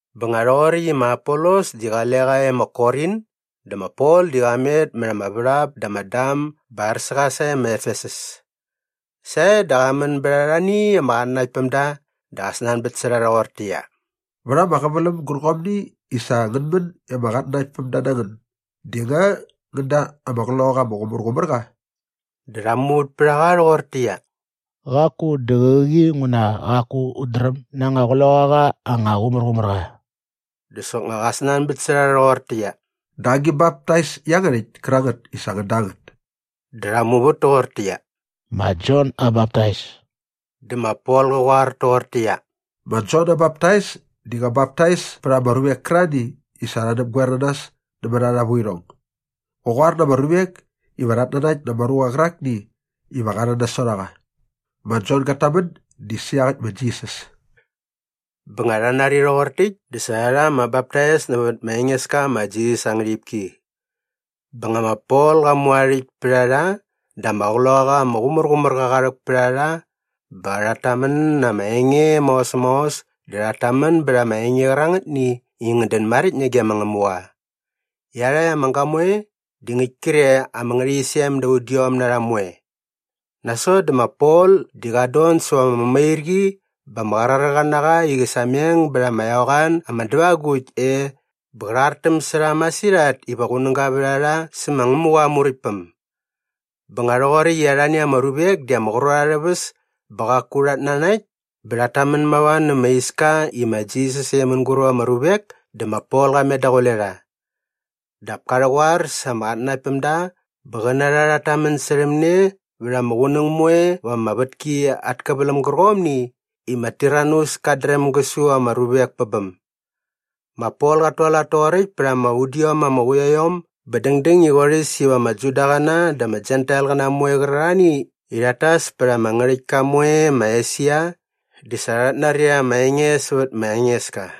Bä nga rhoqoräkt i ma Apolos di qale qa e ma Korin dä ma Pol di qa met mät ama värhap da ama dam bä ar sä qa sae ma Efesus. Sae dä qa män bät arhani ama qatnanaktpämda dä qa snanbät sä rha rhoqortäqyia, “Vät ama qäväläm gärqomni i sa ngän män i ama qatnanaktpämda na ngän di nga ngän da ama Qloqaqa ama Qumärqumärqa?” Dä rha muvät pät a qa rhoqortäqyia, “Qaku, dä qäqi nguna qaku ut dräm na anga Qloqaqa anga Qumärqumärqa.” Dä soknga qa snanbät sä rha rhoqortäqyia, “Dä agi baptais iangärhäkt kärangät i sa ngän da ngät?” Dä rha muvät toqortäqyia, “Ma Jon aa baptais.” Dä ma Pol qä qoar toqortäqyia, “Ma Jon aa baptais di qä baptais pät ama ruvek kärarhani i sa rha näpgoer na nas nämät arha vuirhong. Qä qoar na ama ruvek iva rhat nanakt na ama ruqa qärakni iva qa rhän nasot a qa. Ma Jon gat tamän di sä iaqäkt ma Jisas.” Bä nga rha nari rhoqor täkt dä sa rha rha ama baptais nävät ma Engeska ma Jisas aa ngärhipki. Bä nga ma Pol qa mu aa rhäkt pät a rha dä ama Qloqaqa ama Qumärqumärqa qa rhäk pät a rha bä rhat tamän na ama enge maos maos dä rhat tamän bät ama enge qärangätni i ngät dän maräkt nage ma Ngämuqa. Iarhakt ama gamoe di ngäkt kre ama ngärhäqyisem da udiom na rha moe. Nasot dä ma Pol di qat don säva ama mämairqi bä ama qraräqa na qa i qä sameng bät ama eqoan ama dävagukt e bä qä rhartäm sä rha masirhat iva qunäga vät a rha sä ma Ngämuqa aa Muräktpäm. Bä nga rhoqoräkt i arhani ama ruvek di ama qrot arhä väs bä qaku rhat nanakt bä rhat tamän mava nä ma Iska i ma Jisas e mänguräp ama ruvek dä ma Pol qa met daqule rha. Dap ka rhäqoar sa ama qatnanaktpämda bä qä na rha rhat tamän särhäm ne vät ama qunäng moe va ama vätki at käväläm gärqomni i ma Tiranus kat dräm gä su ama ruvek pä bäm. Ma Pol qat tualat toqoräkt pät ama udiom ama quiaiom bä dängdäng i qorhäs iva ama Judaqäna dä ama Jentailqäna moe qärarhani i rhat tas pät ama ngärhäktka moe ma Esia di sa rhat nari ama enge sävät ma Engeska.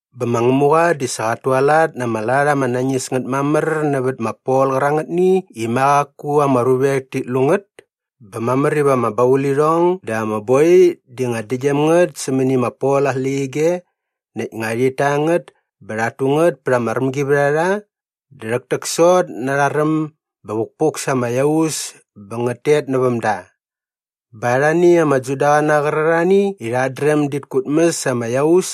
Bä ma Ngämuqa di sa qat tualat na ama lat ama nañis ngät mamär nävät ma Pol qärangätni i ma qaku ama ruvek tit lu ngät bä mamär iva ama baulirhong dä ama boi di nga däktgyäm ngät sämäni ma Pol aa släqyige näkt nga rhit ta ngät bä rhat tu ngät pät ama rämgivärharha dä rhäktäksot na arha räm bä vukpuk sa ama iaus bä ngät tet näväm da. Bä arhani ama Judaqäna qärarhani i rhat dräm dit kutmäs ama iaus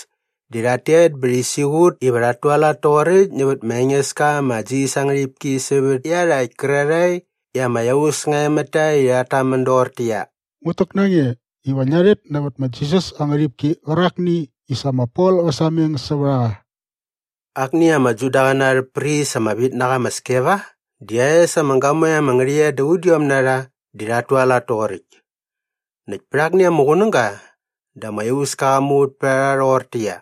di rhat tet bä rhi siqut iva rhat tualat toqoräkt nävät ma Engeska ma Jisas aa ngärhipki sävät iarhakt kärarhae i ama iaus nga e mät ta i rhat tamän doqortäqyia, “Ngut täk na nge iva ngia rhet nävät ma Jisas aa ngärhipki qärakni i sa ma Pol qä sameng sävät a qa.” Akni ama Judaqäna arhä pris ama vit na qa ma Skeva di aa es ama gamoe ama ngärhäqyet da udiom na rha di rhat tualat toqoräkt. Näkt pät akni ama qunäga dä ama iauska qa muvät pät a rha rhoqortäqyia,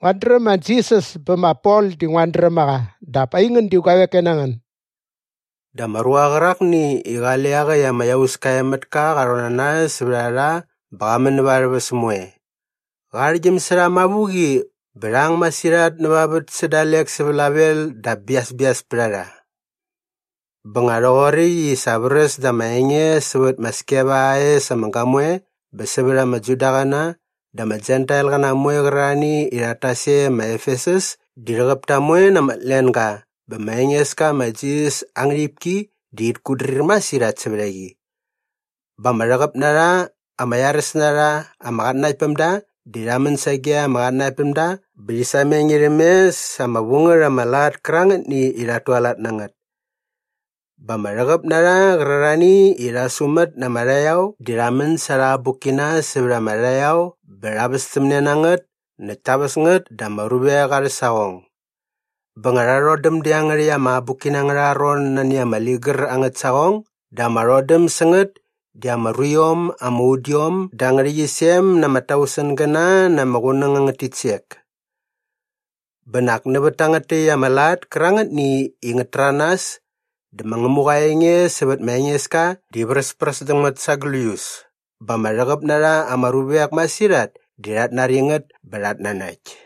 “Nguat dräm ma Jisas bä ma Pol di nguat dräm a qa dap aingän di guavek koe na ngän?” Dä ama ruqa qärakni i qale iaqäkt ama iauska e mät ka qa rhon na nas sävät a rha bä qa män näva arhä väs moe. Qa arhäktgyäm sä rha mavuqi bä rha ang masirhat näva vät sä dalek sä vlavel dap biasbias pät a rha. Bä nga rhoqoräkt i sa vräs da ama enge sävät ma Skeva aa es ama gamoe bä sävät ama Judaqäna dä ama Jentailqäna moe qärarhani i rhat tas e ma Efesus di rhäqäp ta moe na ama tlenga bä ma Engeska ma Jisas aa ngärhipki di rhit kutdrir masirhat sävät a qi. Bä ama rhäqäp na rha ama iaräs na rha ama qatnanaktpämda di rha män sage ama qatnanaktpämda bä rhi sameng irhäm mes sa ama vu ngät ama lat kärangätni i rhat tualat na ngät. Bä ama rhäqäp na rha qärarhani i rha sumät na ama rhaqyao di rha män sa arha abukkina sävät ama rhaqyao bä rha västämne na ngät näkt ta väs ngät da ama ruvek arhä saqong. Bä nga rha rhodäm dä iangärhäkt ama abukkina angärha ron nani ama ligär angät saqong dä ama rhodäm sä ngät di ama ruiom ama udiom da ngärhäqyisem na ama tausengäna na ama qunäng angät titsek. Bä nak nävät tangät täkt ama lat kärangätni i ngät täranas dä ma Ngämuqa aa enge sävät ma Engeska di vräspräs däm ngät sa gläius bä ama rhäqäp na rha ama ruvek masirhat di rhat nari ngät bä rhat nanakt.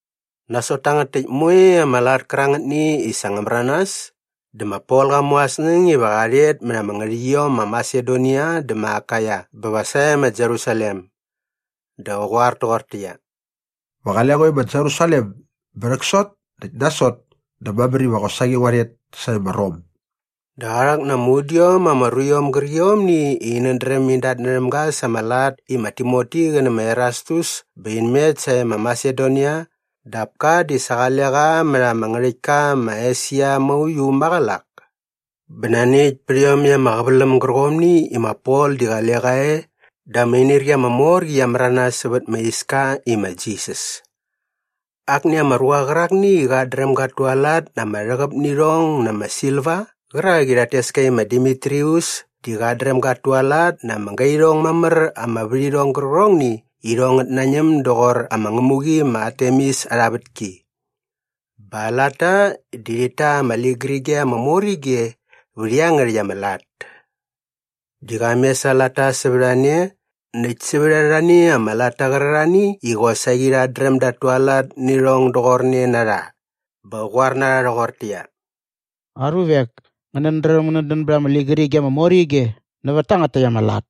Nasot tangät täkt moe ama lat kärangätni i sa ngä märanas dä ma Pol qa mu aa snäng iva qa rhet mät ama ngärhäqyiom ma Masedonia dä ma Akaia bä va sae ma Jerusalem. Dä qä qoar toqortäqyia, “Va qale ngo e ma Jerusalem bä rhäksot näkt nasot dä mamär iva qosaqi ngua rhet sae ma Rom.” Dä qa rhäk na ama udiom ama ruiom gärqiomni i inät dräm in datnärhäm ga sa ama lat i ma Timoti qä nä ma Erastus bä in met sae ma Masedonia dap ka di sa qale qa mät ama ngärhäktka ma Esia mauiu maqälak. Bä nani äkt pät iomäkt ama qäväläm gärqomni i ma Pol di qale qa e dä ama inirqi ama mor qi qia märanas sävät ma Iska i ma Jisas. Akni ama ruqa qärakni i qat dräm gat tualat na ama rhäqäp nä irhong na ama silva qärak i rhat tes ka i ma Demitrius di qat dräm gat tualat na ama gairhong mamär ama värhirhong gärqärhongni i irhong ngät nañäm doqor ama ngämuqi ma Artemis arha vätki. Bä aa latta di rhit ta ama ligärige ama mor ige vät iangärhäkt ama lat. Di qa mes aa latta sävät a ne näkt sävät arhani ama latta qärarhani i qosaqi rhat dräm dat tualat nä irhong doqorne na rha bä qä qoar na rha rhoqortäqyia, “Aruvek, ngänät dräm ngänät dän bät ama ligärige ama mor ige nävät tangät täkt ama lat.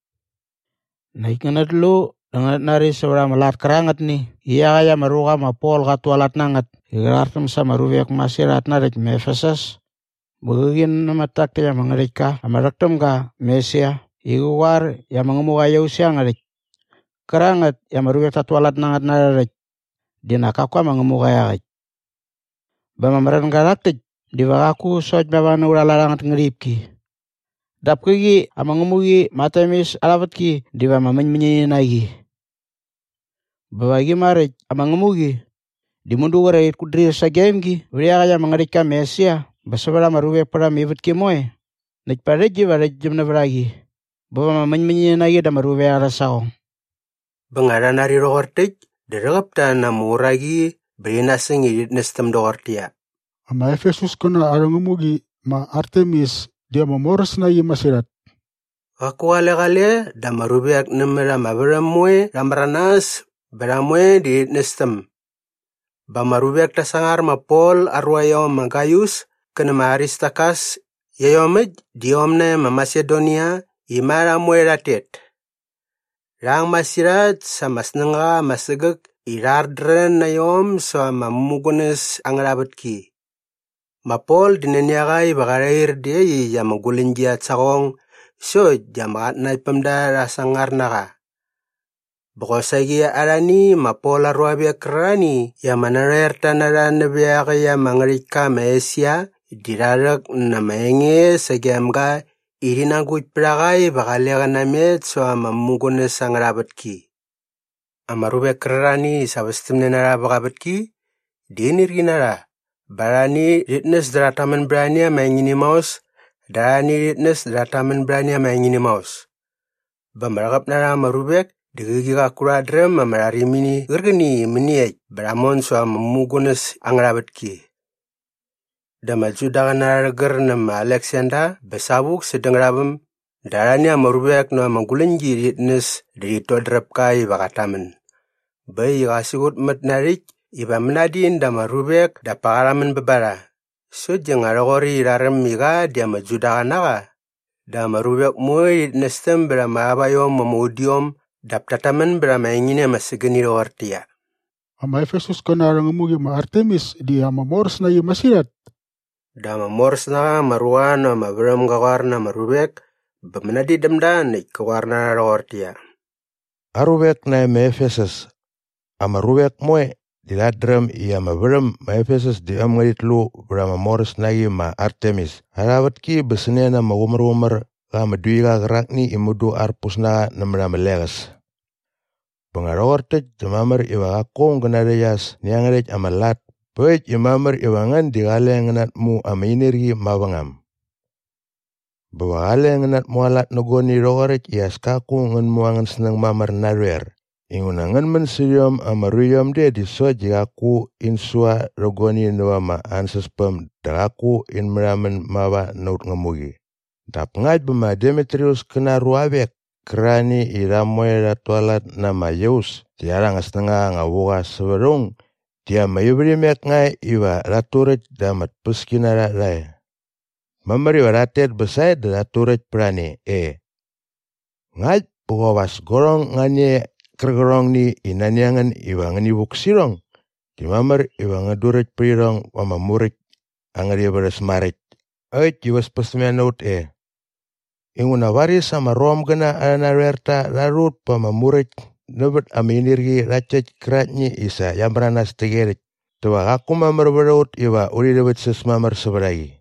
Näkt ngänät lu dä ngänät nari sävät ama lat kärangätni i iaqäkt ama ruqa ma Pol qat tualat na ngät i qä rhartäm sa ama ruvek masirhat narhäkt ma Efesus bä qäqi nämät tak täkt ama ngärhäktka ama rhäk täm ga ma Esia i qä qoar i ama ngämuqa aa iaus iangärhäkt kärangät i ama ruvek tat tualat na ngät na arhä rhäkt di nak kaku ama ngämuqa iaqäkt. Bä ama märänga rhak täkt diva qaku sokt mava na aurha lat angät ngärhipki dap käqi ama ngämuqi ma Artemis arha vätki diva ama mäñmäñini na qi. Bä va qi maräkt ama ngämuqi di mudu qre rhit kutdrir sagem gi vät iaqäkt ama ngärhäktka ma Esia bä sävät ama ruvek pät ama ivätki moe näkt pa rhäkt diva rhäktgyäm nävät a qi bä va ama mäñmäñini na qi da ama ruvek arhä saqong.” Bä nga rha nari rhoqor täkt dä rhäqäp ta na ama uraqi bä rhi nasäng i rhit nästäm doqortäqyia, “Ama Efesuskäna arhä ngämuqi ma Artemis di ama moräs na qi masirhat!” Qaku qale qale dä ama ruvek nämät ama värhäm moe rha märanas bä rha moe di rhit nästäm. Bä ama ruvek ta sangar ma Pol aa ruaiom ma Gaius kä nä ma Aristarkas iaiomäkt di iom nae ma Masedonia i ma rha moe rhat tet. Rha ang masirhat sa ama snängaqa ama sägäk i rha rhardrän na iom säva ama mämugunäs angärha vätki. Ma Pol di nani a qa iva qa rhair dä iaqyäkt ama guläñgi at saqong sokt di ama qatnanaktpämda rha sangar na qa. Bä qosaqi arhani ma Pol aa ruavek kärarhani i ama narhoerta na rha nävä iaqäkt ama ngärhäktka ma Esia di rha rhäk na ama enge sagem ga i rhi nagukt pät a qa iva qale qä namet säva ama mämugunäs angärha vätki. Ama ruvek kärarhani i sa västämne na rha vä qa vätki di inirqi na rha bä arhani rhit näs dä rhat tamän bät ani ama engini maos dä arhani rhit näs dä rhat tamän bät ani ama engini maos. Bä ama rhäqäp na rha ama ruvek di qäqi qaku rhat dräm ama rharimini qärqäni i mäniekt bä rha mon säva ama mämugunäs angärha vätki. Dä ama Judaqäna rha rhägär nä ma Aleksander bä savuk sädä ngärhaväm dä arhani ama ruvek näva ama guläñgi rhit näs dä rhit dodräp ka iva qat tamän. Bä äkt i qa siqutmät na aa rhäkt iva mänadin da ama ruvek dap pa qa rhamän bä ba rha sokt di nga rhoqoräkt i rha räm i qa di ama Judaqa na qa dä ama ruvek moe rhit nästäm bät ama auaiom ama udiom dap tat tamän bät ama engini ama sägäni rhoqortäqyia, “Ama Efesuskäna arhä ngämuqi ma Artemis di ama moräs na qi masirhat!” Dä ama moräs na qa ama ruqa näva ama värhäm ga qoar na ama ruvek bä mänadin däm da näkt kä qoar na rha rhoqortäqyia, “Aruvek nae ma Efesus, ama ruvek moe di rhat dräm i ama värhäm ma Efesus di äm ngärhit lu vät ama moräs na qi ma Artemis arha vätki bä sä ne na ama qumärqumär qa ama duiqa qärakni i mudu arpus na qa nämät ama leqäs. Bä nga rhoqor täkt dä mamär iva qaku aung gä narhäqyas nä iangärhäkt ama lat bä äkt i mamär iva ngän di qale ngän natmu ama inirqi mavängam. Bä va qale ngän natmualat nä guani rhoqoräkt i as kaku ngän mu angän snäng mamär narhoer inguna ngän män sä rhiom ama ruiom de sokt di qaku in sua rhä guani näva ama ansäspäm dä qaku in märhamän mava na aut ngämuqi. “Dap ngakt bä ma Demitrius kä na aa ruavek kärarhani i rha moe rhat tualat na ama iaus di arha anga snängaqa anga vu qa sävät aung di ama ivärhimek nga e iva rhat turäkt dä ama tpäskinarha rha e. Mamär iva rhat tet bä sae dä rhat turäkt pät a ne e. Ngakt bä qop as guarhong nga ni e qärqärhongni i nani a ngän iva ngäni vuk sä irhong di mamär iva ngän duräkt pät irhong ba ama muräkt angärha ivärhäs maräkt äkt i väspästämne na ut e. Inguna varis ama Romgäna arhä narhoerta rha rhu ut pa ama muräkt nävät ama inirqi rhakt täkt käraktni i sa qia märanas täqyerhäkt dä va qaku mamär vät a ut iva urhi rhäväktsäs mamär sävät a qi.”